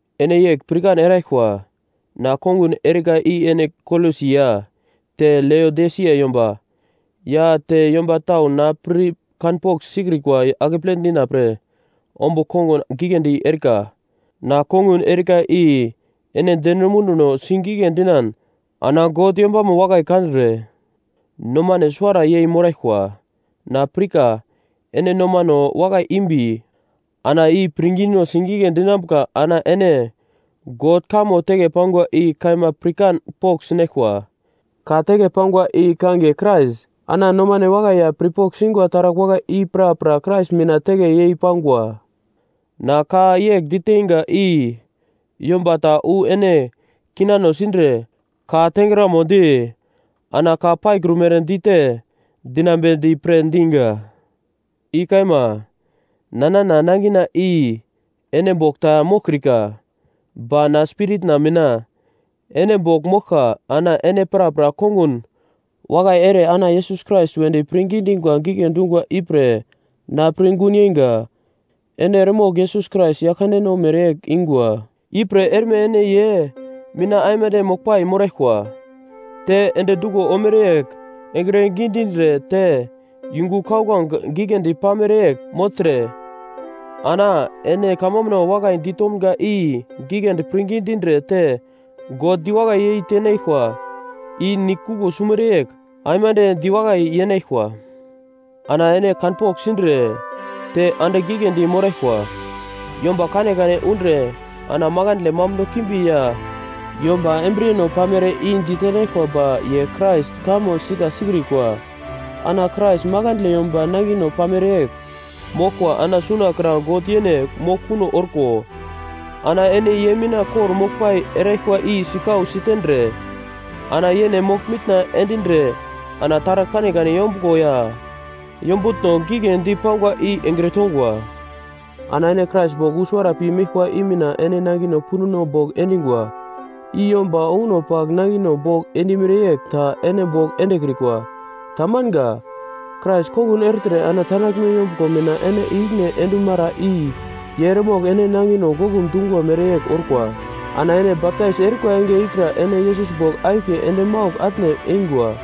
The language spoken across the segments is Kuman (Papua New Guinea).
Ene yegl pirkan eraglkwa. Na kongun erika i ene Kolosi ya te Leodisia yomba, ya te yomba tau na pir kanpogl sikrikwa akeple dina pre ombugl kongun giglendi erika. Na kongun erika i ene deno munduno sigigle dinan ana God yombamo wakai kandre nomane suwara yei moraglkwa, na pirka ene nomano wakai imbi ana i pirngino sigigle dinambuka ana ene God kamo teke pangwa i kaima pirkan pogl sinaglkwa, ka teke pangwa i kangiye Krais. Ana nomano wakai ya pirpogl singwa taragl wakai i prapra Krais mina teke yei pangwa. Na ka yegl diteinga i yomba ta wu ene kinano sindre, ka tengramodi ana ka paikrumere dite dinambedi pre diga. I kaima, na nana nangina i ene bogl ta moglkrika, ba na spiritna mina ene bogl moglka ana ene prapra kongun wakai ere ana Yesus Krais wedi pirngi dingwa gigle dungwa ipre na pir gun yeingwa. Ene eremogl Yesus Krais Yaglkandeno mereyegl ingwa, ipre erme ene ye mina aimande moglpai moraglkwa, te endi duglo ormere yegl engre gidindre te yungu kauglange giglendi pamere yegl mogltre, ana ene kamambuno wakai ditomga i giglendi pirngi dindre te God diwakai yei tenaglkwa i nigl kuglo sumere yegl aimande diwakai yenaglkwa. Ana ene kanpogl sindre te andigl giglendi moraglkwa, yomba kanekane undre ana makandle mambuno kimbi ya yomba embriyeno pamere i di tenaglkwa ba ye Krais kamo sika sikrikwa. Ana Krais makandle yomba nangino pamere yegl moglkwa ana suna kra God yene mogl kuno orko, ana ene ye mina kor-moglpai eraglkwa i sikau sitendre ana yene mogl-mitna endindre ana taragl kanekane yombuglo ya yombutno gigledi pangwa i engre tongwa. Ana ene Krais bogl wu suwara pi meglkwa i mina ene nangino punduno bogl endingwa, i yomba onguno pagl nangino bogl endimere yegl ta ene bogl endekrikwa, ta manga. Krais kongun ertre ana tandaglme yombuglo mina ene ikine endumara i ye eremogl ene nangino goglum dungwa mere yegl orkwa. Ana ene baptais erikwa enge ikra ene Yesus bogl akiye ende maugl atne eingwa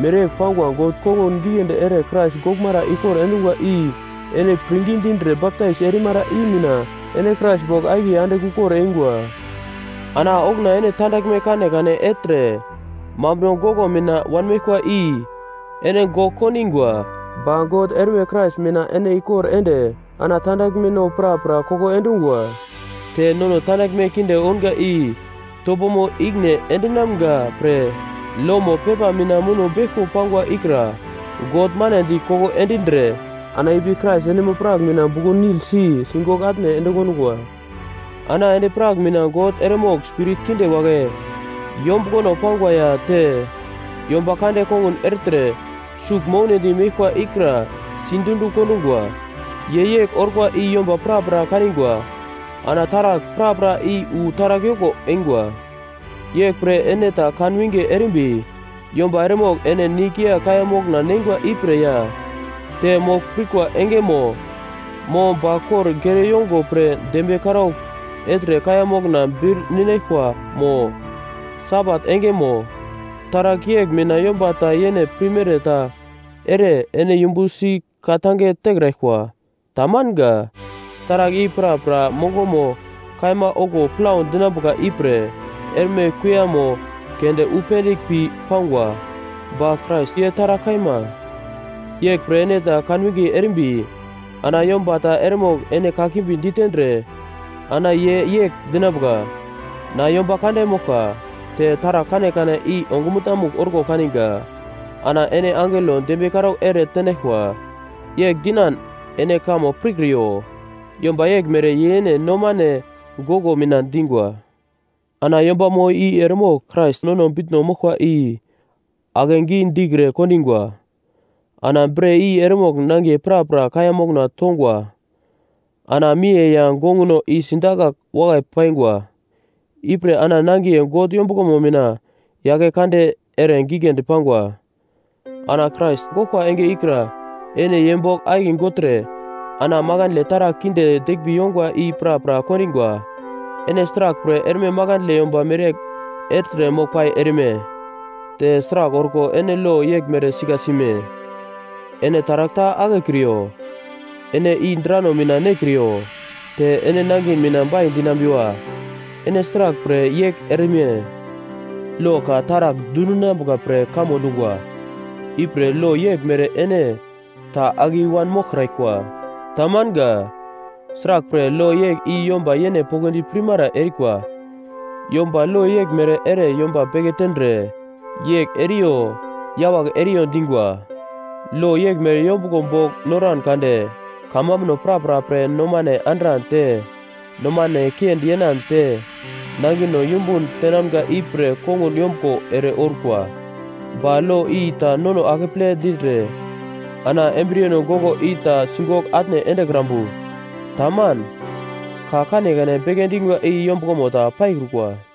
mereyegl pangwa God kongun giglendi ere Krais goglmara ikor endungwa i ene pirngi dindre baptais erimara i mina ene Krais bogl akiye andigl ukor eingwa. Ana okuna ene tandaglme kanekane ertre mambuno goglo mina wanmeglkwa i ene gogl kondingwa. Ba God erme Krais mina ene ikor ende ana tandaglmeno prapra koko endungwa. Te nono tandaglme kinde ounga i topomo ikine endinamga pre lomo pepa mina muno beglko pangwa ikra God manedi koko endindre ana ipi Krais endimo-prak mina buglo-nil si sigogl atne ende kondungwa. Ana endi-prak mina God eremogl spirit kinde wagle yombuglono pangwa ya te yomba kande kongun ertre sugl mounedi meglkwa ikra sidundi kondungwa. Ye yegl orkwa i yomba prapra kanigwa, ana taragl prapra i wu taragl yoko eingwa. Yeglpre ene ta kan winge erimbi yomba eremogl ene nigl ya kaiya mokna neingwa ipre ya, te mogl pirkwa engemo, mo ba kor gere yongo pre dembiye karaugl ertre kaiya mokna bir ninaglkwa mo, Sabat engemo, taragl yegl mina yomba ta yene pirmere ta ere ene yumbu si ka-tange tekraglkwa. Ta manga. Taragl i prapra mongomo kaima okuwo plau dinambuka ipre erme kuiyamo keunde wu pendigl pi pangwa, ba Krais ye taragl kaima. Yeglpre ene ta kan winge erimbi ana yomba ta eremogl ene kakimbi ditendre ana ye yegl dinambuka: Na yomba kande moglka, te taragl kanekane i ongumutna-mugl orko kaninga, ana ene angelo dembiye karaugl ere tenaglkwa, yegl dinan ene kamo pirkriyo. Yomba yeglmere ye yene nomane goglo mina dingwa. Ana yombamo i eremogl Krais nono bitno moglkwa i akegi dikre kondingwa. Ana bre i eremogl nangiye prapra kaiya mokna tongwa ana miye ya gonguno i sidakagl wakai paingwa. Ipre ana nangiye God yombuglomo mina yake kande ere giglendi pangwa. Ana Krais goglkwa enge ikra ene ye bogl akiye gogltre ana makandle taragl kinde deglmbi yongwa i prapra kondingwa. Ene sraglpre erme makandle yomba mereyegl ertre moglpai erime? Te sragl orko ene lo yeglmere sika sime? “Ene taragl ta akekriyo. Ene i drano mina nekriyo, te ene nangin mina bai dinambiwa.” Ene sraglpre yegl erime? Lo ka taragl dundinambuka pre kamo dungwa. Ipre lo yeglmere ene ta ake i-wan moglkraglkwa. Tamanga. Sraglpre, lo yegl i yomba yene poglodi pirmara erikwa. Yomba lo yeglmere ere yomba beke tendre, yegl eriyo yawagl eriyo dingwa. Lo yeglmere yombuglo bogl noran kade kamambuno prapra pre nomane andran te nomane kiendi yenan te nangino yumbun tenamga ipre kongun yombuglo ere orkwa. Ba lo i ta nono akeple dindre ana embriyeno goglo i ta sigogl atne endekrambu. Taman. Ka kanekane beke dingwa i yombuglomo ta paikrukwa.